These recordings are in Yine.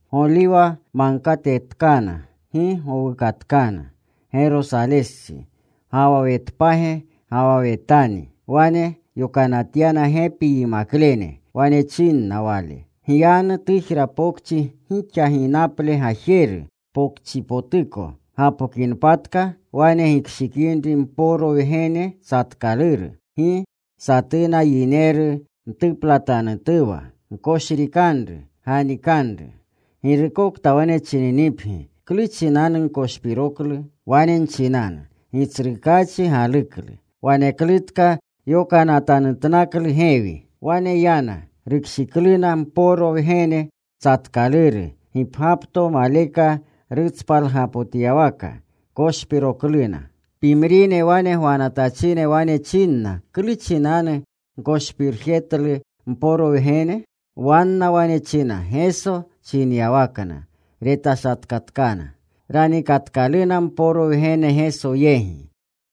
Goliwa Magkatetkana. Gi gowukatkana Gerosalestsi, ga wa Wetpage ga wa Wetani. Wane yokanatyana gepi yimaklene. Wane chinna Wale, “Gyanu tujra pokchi gixa ginaple gajeru. Pokchipotuko gapokinpatka wane gikshikinri mporo wgene tsatkaluru, gi satuna yineru mtuplatjitanutuwa. Gkoshrikanru. Ganikanru. Girukokta wane chininipgi, ‘¿Klu chinanugkoshpiroklu?’ wane nchinanu, ‘Gitsrukaachi galuklu. Waneklutka yokanatanutnaklu gewi.’” Wane yana. Rukshikluna mporo wgene tsatkaluru gipgyapto maleka rutspalgapotyawaka. Koshpirokluna. Pimrine wane gwanatachine wane chinna, “¿Klu chinanu gkoshpirjetlu mporo wgene?” Wanna wane china Geso chinyawakna. Retashatkatkana. Ranikatkaluna mporo wgene Geso yegi.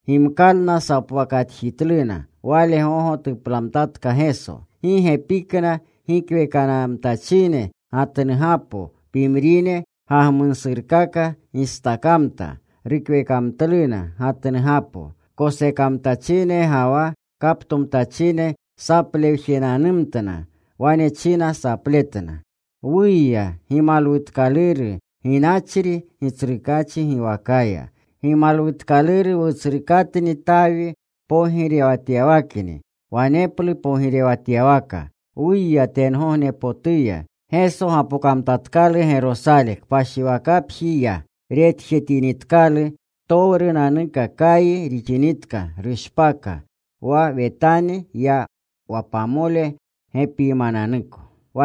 Gimkalna sapwakatjitluna. Wale gogo tuplamtatka Geso. Gi gepikna gikwekamkatachine gatnugapo. Pimrine gagmunasurkaka gistakamta. Rukwekamtluna gatnugapo. Kosekamtachine ga wa kaptomtachine saplewjenanumtna. Wane china sapletna: ¡Wuya! ¡Gimalwutkaluru ginachri Gitsrukaachi giwakaya! ¡Gimalwutkaluru wutsrukatni Tawi pogirewtapyawakni! Waneplu pogirewatyawaka. ¡Wuya tengognepotuya! Geso gapokamtatkalu Gerosale. Kpashiwakapji ya. Retjetinitkalu ptowrunanuka, kayi rixinitka rushpaka. Wa Wetani ya wa pamole gepiymananuko.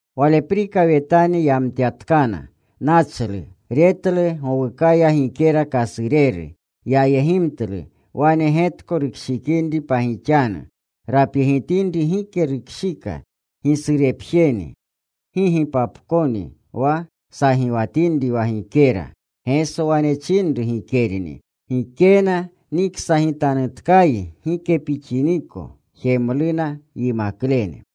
Waleprika Wetani yamtyatkana. Nachlu. Retlu gowukaya gikera kasureru. Yayegimtlu, wane getko rukshikinri pagixanu. Rapyegitinri gike rukshika. Gisurepjeni. Gi gipapkoni wa sagiwatinri wa gikera. Geso wane chinanru gikerni, “Gikena niksagitanutkayi gike pixiniko.” Jemluna yimaklene.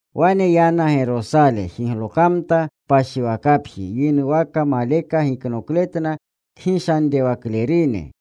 Wane yana Gerosale. Jiglokamta kpashiwakapji. Yinuwaka maleka giknokletna kgishanrewaklerunni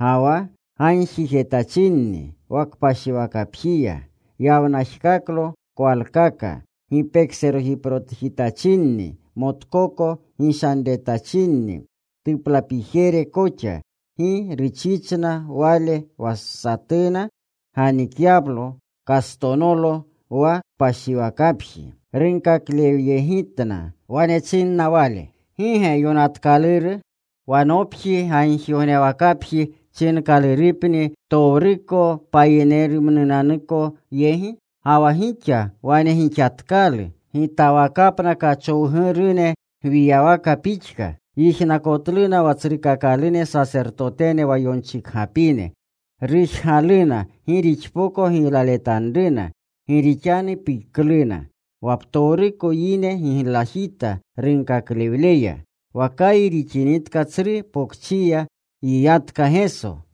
ga wa gagjijetachinni wa kpashiwakapjiya. Yawnajkaklo kwalkaka gipekoserojiprojitachineni, motkoko gishanretachinni tuplapijere koxa. Gi ruchichna Wale wa satuna ganikyalo kastonolo wa kpashiwakapji. Runkaklewyegitna. Wane chinna Wale, “¿Gi ge yonatkaluru: Wa nopji gagjigognewakapji chinkalurupni ptowruko payinerumnunanuko yegi? Ga wa gixa wane gixatkalu gitawakapna kachowgurune gwiyawaka pixka.” Yijnakotluna wa tsrukakalune sasertotene wa yonchikgapine. Rujgaluna gi rixpoko giylaletanruna gi rixanu pikluna. Wa ptowruko yine giglajita runkaklewleya. Wa kayi rixinitka tsru pokchiya yiyatka Geso.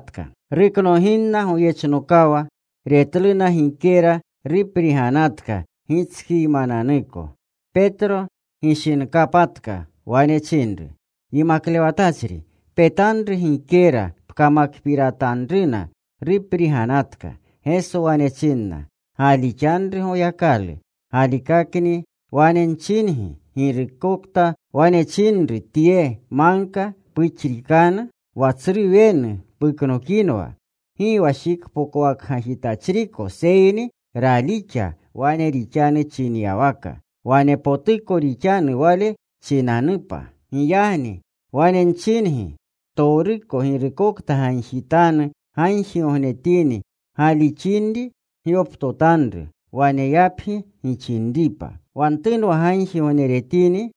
Ruknoginna goyechnokawa, retluna gikera rupriganatka gitskiymananuko. Petro gishinkapatka. Wane chinru, “Yimaklewatachri, petanru gikera pkamakpiratanruna rupriganatka.” Geso, wane chinna, “Galixanru Goyakalu. Galikaka wane nchingi, katukokta wane chinru tye magka, ‘Puxrikanu. Wa tsru wenu puknokinwa.’ Gi wa shikpokwakgajitachriko, seyni ralixa wane rixanu chinyawaka, wanepotuko rixanu wale chinanupa. Giyagni wane nchingi, ptowruko girukokta gagjitanu gagjigognetini, galixinri gyoptotanru, waneyapgi gixinripa. Wa ntunwa gagjigogneretini,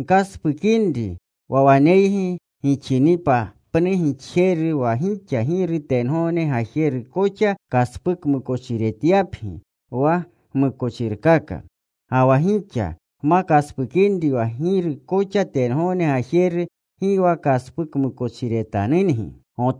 gkaspukinri wa waneygi gixinipa pnu gixjeru, wa gixa Giru tengogne gajeru koxa kaspukmukochiretyapgi wa gmukochirkaka. Ga wa gixa gma kaspukinri, wa Giru koxa tengogne gajeru gi wa kaspukmukochiretanungi.”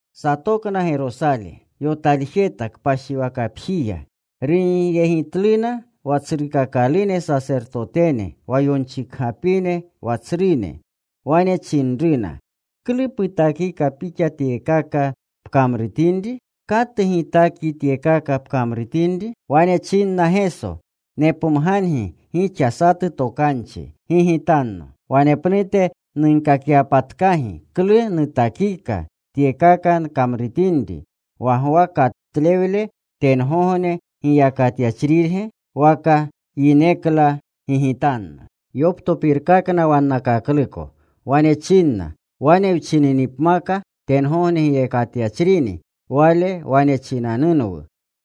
Satokna Gerosale. Yotaljeta kpashiwakapjiya. Runyegitluna wa tsrukakalune sasertotene, wa yonchikgapine, wa tsrune. Wane chinruna, “¿Klu putakika pixa tyekaka pkamrutinri? ¿Katu gitakyi tyekaka pkamrutinri?” Wane chinna Geso, “Nepomgangi gixa satu tokanchi. Gigitanno. Wanepnute nunkakyapatkagi klu nutakika tyekaka nkamrutinri. Wa Gwa katlewle, ¿tengogne giyakatyachrirge? ¿waka yinenukla? Gigitanno.” Yoptopirkakna wannakakluko. Wane chinna, “Wane wchininipmaka tengogne giyakatyachrini, Wale wane chinanunwu,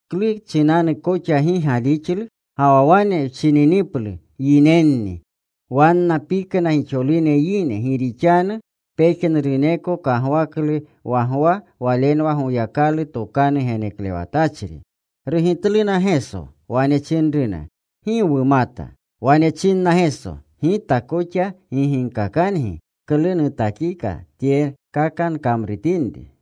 ‘¿Klu chinanu koxa gi galixlu?’ Ga wa wane wchiniplu, ‘Yinenni’ ”—wanna pikna gixolune yine, gi rixanu pejnuruneko kagwaklu wa Gwa walenwa Goyakalu tokanu geneklewatachri. Rugitluna Geso. Wane chinruna, “Gi wumata.” Wane chinna Geso, “Gita koxa gi ginkakangi klu nutakika tyekaka nkamrutinri.”